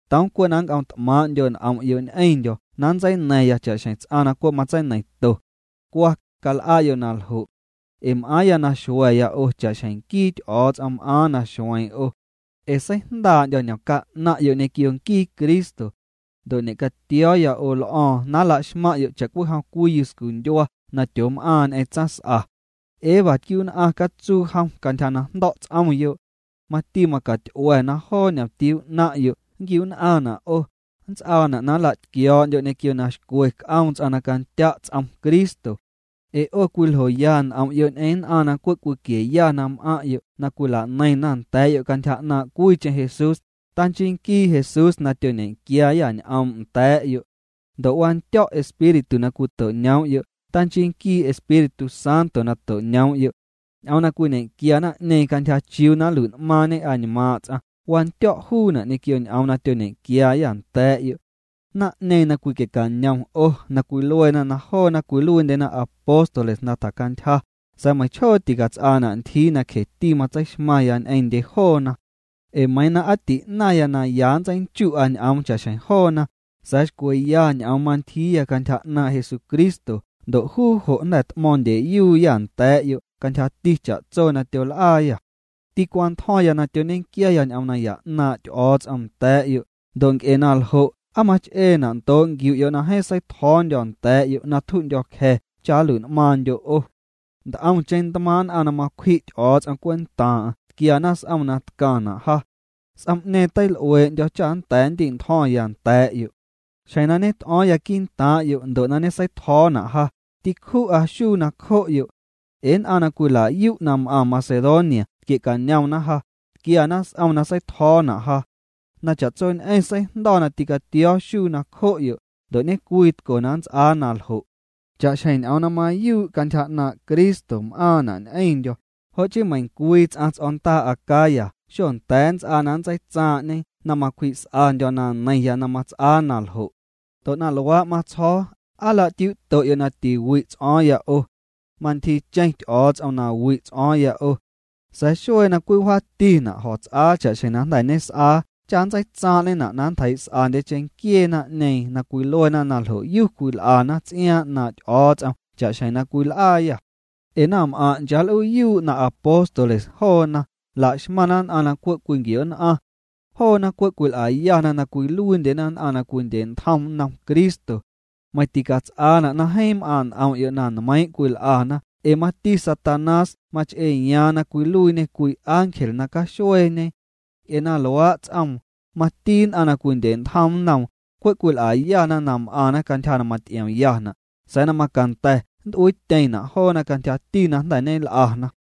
Toom cwe' na nnc'omt'maaⁿ'ndyo' n'om'yo' ñ'eⁿndyo̱ na nntseina̱ⁿ cha'xjeⁿ ts'aⁿ na cwe' matseineiⁿto. Cwa, cal'a'yo' na ljo'. Ee m'aaⁿya na xua̱ya 'o cha'xjeⁿ nquii Ty'o̱o̱ts'om m'aaⁿ na xueeⁿ 'o. Ee seijndaa'ndyo̱ ñomca 'naⁿ'yo' ñequio nquii Cristo. Ndo' ñe'catio̱o̱ya 'o l'o̱o̱ⁿ na nla'xmaⁿ'yo' cha'cwijom cwii yuscundyua na tyoom'aaⁿ ñ'eⁿ tsaⁿs'a. Eva tquiu'nn'aⁿ catsuu jom cantyja na jndo̱' ts'omyo'. Mati macat'ua̱ na joo ñomtiuu 'naⁿ'yo' nnquiu'nn'aⁿna' 'o, nnts'aana' na nla'tquio̱o̱'ndyo' ñequio na xcwe c'oom ts'aⁿ na candya' ts'om Cristo. Ee 'o cwiljoya n'om'yo' ñ'eⁿ nn'aⁿ na cwe' cwiquieya na m'aⁿ'yo' na cwila'neiⁿna nda̱a̱'yo' cantyja 'naaⁿ' cwiicheⁿ Jesús, tanchii nquii Jesús na tyoñequiaayâ ñ'oom' nda̱a̱'yo'. Ndo' wandyo̱' espírtu na cwito'ñoom'yo', tanchii nquii Espíritu Santo na to'ñoom'yo'. Ñ'oom na cwiñequia naⁿ'ñeeⁿ cantyja chiuu na nlui'n'maaⁿñe añmaaⁿ' ts'aⁿ, wandyo̱' juuna' ñequio ñ'oom na tyoñequiaayâ nda̱a̱'yo'. Naⁿ'ñeeⁿ na cwiquie'cañom 'o na cwiluena na joona cwiluiindyena apóstoles na tjacantyja, sa̱a̱ meiⁿchjoo ticats'aana' ntyjii na cjeti matseixmaⁿya ñ'eⁿndye joona. Ee meiiⁿ na aa ti'naⁿya na ya nntseinchu'a ñ'oom cha'xjeⁿ joona, sa̱a̱ xcweya ñ'oom mantyjiiya cantyja 'naaⁿ' Jesucristo ndo' juu jo' jnda̱ t'mo̱o̱ⁿndyeyuuyâ nda̱a̱'yo' cantyjati cha'tso na tyol'aayâ. Tîcwantjo̱ⁿya na tyoñequiaya ñ'oom naya 'naaⁿ' Ty'o̱o̱ts'om nda̱a̱'yo', ndo' nc'e na ljo' ¿aa mach'eena' ndoo' nquiu'yo' na jeeⁿ seitjo̱o̱ndyo̱ nda̱a̱'yo' na tju'ndyo̱cja̱ cha nluiit'maⁿndyo' 'o? Nt'omcheⁿ ntmaaⁿ' nn'aⁿ na macwji' Ty'o̱o̱ts'om cwentaaⁿ'aⁿ tquiana s'om na tcaⁿna' ja. S'om'ñeeⁿ teil'uee'ndyo̱ cha nnda̱a̱ ndi'ntjo̱ⁿya nda̱a̱'yo'. Xjeⁿ na ñet'o̱o̱ⁿya quii'ntaaⁿ'yo' ndo' na ñeseitjo̱o̱na' ja, tîcju'a xuu nacjo'yo'. Ee nn'aⁿ na cwila'yu' na m'aaⁿ Macedonia tquiecanomna ja, tquiana s'om na seitjo̱o̱na' ja. Na cha'tsoñ'eⁿ seijndo̱ na tîcatio̱o̱ xuu nacjo'yo', ndo' ñecwitco na nnts'aa na ljo'. Cha'xjeⁿ ñ'oom na mayuu' cantyja 'naaⁿ' Cristo m'aaⁿna' ñ'eⁿndyo̱, jo' chii meiⁿcwii ts'aⁿ ts'o̱ndaa Acaya xonnda̱a̱ nnts'aa na nntseitsaaⁿ'ñe na macwji's'andyo' na neiⁿya na mats'aa naljo'. Ndo' na luaa' matsjo̱o̱, ¿aa nla'tiuuto'yo' na tiwi' ts'o̱o̱ⁿya 'o? Mantyjiicheⁿ Ty'o̱o̱ts'om na wi' ts'o̱o̱ⁿya 'o. Sa̱a̱ xuee na cwiwjaatina' jo̱ts'aa cha'xjeⁿ jnda̱ ñes'aa cha nntseitsaaⁿ'ñena' na nntjeii's'andye cheⁿnquiee naⁿ'ñeeⁿ na cwiluena na ljo'yu cwil'ana ts'iaaⁿ 'naaⁿ' Ty'o̱o̱ts'om cha'xjeⁿ na cwil'aayâ. Ee naⁿm'aⁿ' nchaal'uuyuu' na apóstoles joona, la'xmaⁿna nn'aⁿ na cwe' cwinquio'nn'aⁿ. Joona cwe' cwil'ayana na cwiluiindyena nn'aⁿ na cwindyentjom nnom Cristo. Meiⁿ ticats'aana' na jeeⁿ m'aaⁿ' n'om'yo' na nmeiⁿ' cwil'ana ee mati Satanás mach'eeyaaⁿ na cwiluiiñê cwii ángel na caxueeñe. Nc'e na luaa' ts'oom, mati nn'aⁿ na cwindye'ntjom nnoom, cwe' cwil'ayana na m'aⁿna cantyja na maty'iomyana', sa̱a̱ na macanda̱ nnt'uiityeⁿna' joona cantyjati na jnda̱ ñel'ana.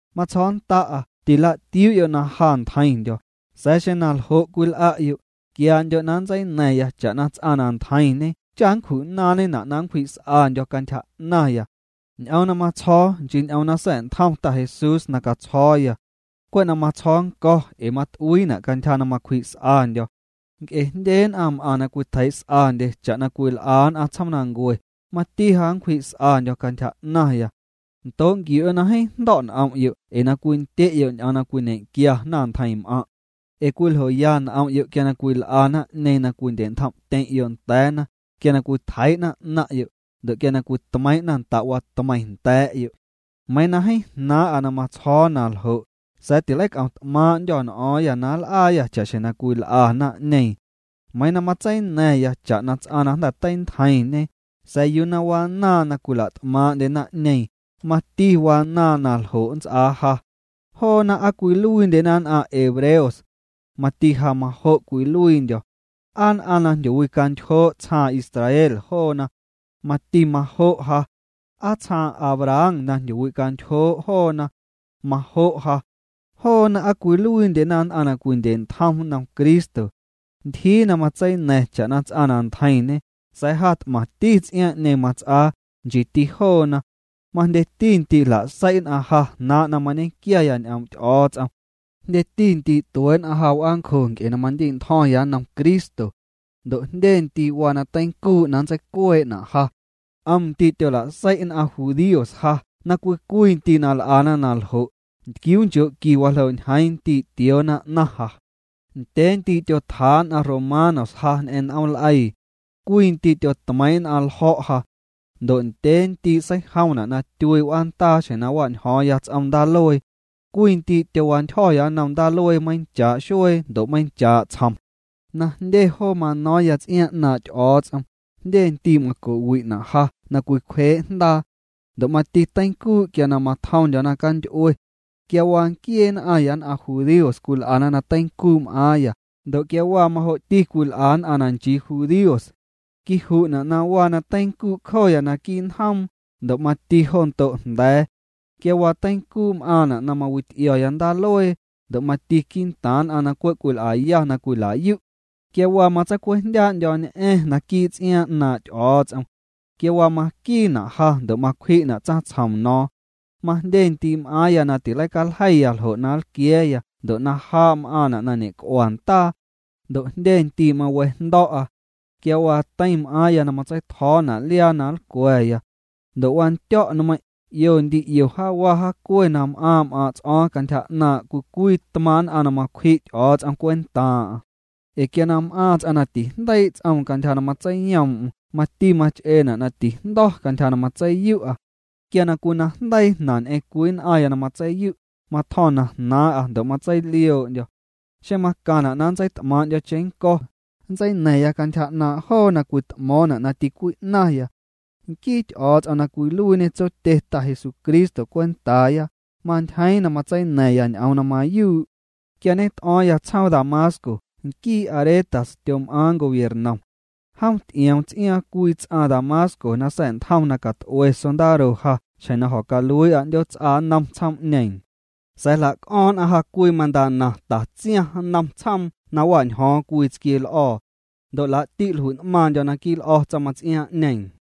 Matsjo̱o̱nnda'a tila'tiuu'yo' na ja ntjeiⁿndyo̱, sa̱a̱ xeⁿ na ljo' cwil'a'yo', quiandyo' na nntseina̱ⁿ cha'na ts'aⁿ na ntjeiⁿñe cha nncju'naaⁿñena' na nncwji's'andyo̱ cantyja 'naⁿya. Ñ'oom na matsjo̱o̱, nchii ñ'oom na sa̱'ntjom Ta Jesús na catsjo̱o̱ya. Cwe' na matsjo̱o̱ nnco̱ ee mat'uiina' cantyja na macwji's'andyo̱. Nc'e jndye nn'aⁿ m'aⁿ na cwitjeii's'andye cha'na cwil'a nn'aⁿ tsjoomnancue, mati ja nncwji's'andyo̱ cantyja 'naⁿya. Ndoo' nquiu'yo' na jeeⁿ jndo̱' n'om'yo' ee na cwindye'yo' ñ'oom na cwiñequia naⁿntjeiⁿm'aⁿ'. Ee cwiljoya n'om'yo' quia cwil'a naⁿ'ñeeⁿ na cwindye'ntjom'tyeⁿ'yo' nda̱a̱na, quia cwitjeii'na 'naⁿ'yo', ndo' quia cwitmeiiⁿ'na nda'watmeiⁿ nda̱a̱'yo'. Meiiⁿ na jeeⁿ jnaaⁿ'a na nntsjo̱o̱ na ljo', sa̱a̱ tileic'o̱ⁿ t'maaⁿ'ndyô̱ n'o̱o̱ⁿyâ na nl'aayâ cha'xjeⁿ cwil'a naⁿ'ñeeⁿ. Meiiⁿ na matseina̱ⁿya cha'na ts'aⁿ na jnda̱ teintjeiⁿñe, sa̱a̱ yuu na wanaaⁿ na cwila't'maaⁿ'ndye naⁿ'ñeeⁿ, mati wanaaⁿ na ljo' nnts'aa ja. Joona, ¿aa cwiluiindyena nn'aⁿ hebreos? Mati ja majo' cwiluiindyo̱. ¿Aa nn'aⁿ na jndyowicantyjoo' tsjaaⁿ Israel joona? Mati majo' ja. ¿aa tsjaaⁿ Abraham na jndyowicantyjoo' joona? Majo' ja. Joona, ¿aa cwiluiindyena nn'aⁿ na cwindye'ntjom nnom Cristo? Ntyjii na matseina̱ⁿ cha'na ts'aⁿ na ntjeiⁿñe, sa̱a̱ ja t'maⁿti ts'iaaⁿ'ñeeⁿ mats'aa, nchiiti joona. Majndyeti ndii' jla'sei' nn'aⁿ ja jnaaⁿ' na mañequiaya ñ'oom' Ty'o̱o̱ts'om. Jndyeti ndii' tuee' nn'aⁿ ja w'aancjo nc'e na mandi'ntjo̱ⁿya nnom Cristo. Ndo' jndye ndii' waa na teincuu' na nntseicuee'na' ja. 'Om ndii' tyola'sei' nn'aⁿ judíos ja na cwii cwii ndii' na l'ana na ljo', ntquiuunchoo'nqui waljoo' ñjeiiⁿ ndii' tioona 'naⁿ ja. Ndyee ndii' tyotjaa' nn'aⁿ romanos ja ñ'eⁿ n'ooml'eii. Cwii ndii' tyotmeiiⁿ' nn'aⁿ ljo̱' ja. Ndo' ndyee ndii' seijomna' na tyuii' w'aandaa xjeⁿ na wa'ñjo̱o̱ⁿya ts'om ndaaluee. Cwii ndii' tyowantyjo̱ nnom ndaaluee meiⁿchaa' xuee ndo' meiⁿchaa' tsjom. Na jndye joo mano̱o̱ⁿya ts'iaaⁿ 'naaⁿ' Ty'o̱o̱ts'om, jndye ndii' maco'wi'na' ja na cwicwjee' jndaa. Ndo' mati teincuu' quia na matjomndyo̱ naⁿcanty'ue. Quia waa nquiee nn'aⁿya nn'aⁿ judíos cwil'ana na teincuu' m'aaⁿya, ndo' quia waa majo'ti cwil'a nn'aⁿ na nchii judíos. Quiju'na' na waa na teincuu' cjoya naquii' njoom, ndo' mati jo ndo' jnda̱a̱. Quia waa teincuu' m'aaⁿna' na mawity'io̱ya ndaaluee, ndo' mati quii'ntaaⁿ nn'aⁿ na cwe' cwil'aya na cwila'yu'. Quia waa na matseicwejndyaa'ndyo̱ñ'a̱ⁿ naquii' ts'iaaⁿ 'naaⁿ' Ty'o̱o̱ts'om. Quia waa maquiina' ja ndo' macwji'na' tsaⁿtsjom no̱o̱ⁿ. Majndye ndii' m'aaⁿya na tileicaljeiya ljo' na nlquia̱a̱ya ndo' na jaa' m'aaⁿna' na ñec'ua ndaa. Ndo' jndye ndii' mawejndo̱'a. Quia waa teiⁿ m'aaⁿya na matseitjo̱o̱na' liaa na nlcwa̱ya. Ndo' wandyo̱' nmeiⁿ', 'io ndii 'io jaawa jaacue na m'aaⁿ' m'aaⁿ' ts'o̱o̱ⁿ cantyja 'naaⁿ' cwii cwii tmaaⁿ' nn'aⁿ na macwji' Ty'o̱o̱ts'om cwentaaⁿ'aⁿ. Ee quia na m'aaⁿ ts'aⁿ na tijndeii' ts'oom cantyja na matseiyoom'm mati mach'eena' na tijndo̱ cantyja na matseiyu'a. Quia na cwinajndeii jnaⁿ ñ'eⁿ cwii nn'aⁿya na matseiyu', matjo̱ⁿ na jnaaⁿ'a ndo' matseilioo'ndyo̱. Xeⁿ macaⁿna' na nntseit'maaⁿ'ndyo̱ cheⁿnnco̱, nntseina̱ⁿya cantyja 'naaⁿ' joo na cwit'mo̱o̱ⁿna' na ticwi'naⁿya. Nquii Ty'o̱o̱ts'om na cwiluiiñê Tsotye Ta Jesucristo cwentaaya, mantyjeeⁿ na matseina̱ⁿya ñ'oom na mayuu'. Quia ñet'o̱o̱ⁿya tsjoom Damasco, nquii Aretas tyom'aaⁿ gobiernom. Jom ty'ioom ts'iaaⁿ cwii ts'aⁿ Damasco na sa̱'ntjom na cat'ue sondaro ja xjeⁿ na jo̱caluii'a 'ndyoots'a nnom tsjoom'ñeeⁿ. Sa̱a̱ jla'c'o̱ⁿ nn'aⁿ ja cwii mantana tatsiaⁿ nnom tsjoom na wa'njo̱o̱ⁿya cwii tsquieel'o̱o̱. Ndo' laa'ti' jlui'n'maaⁿndyo̱ naquii' l'o̱ tsaⁿmaⁿts'iaaⁿ'ñeeⁿ.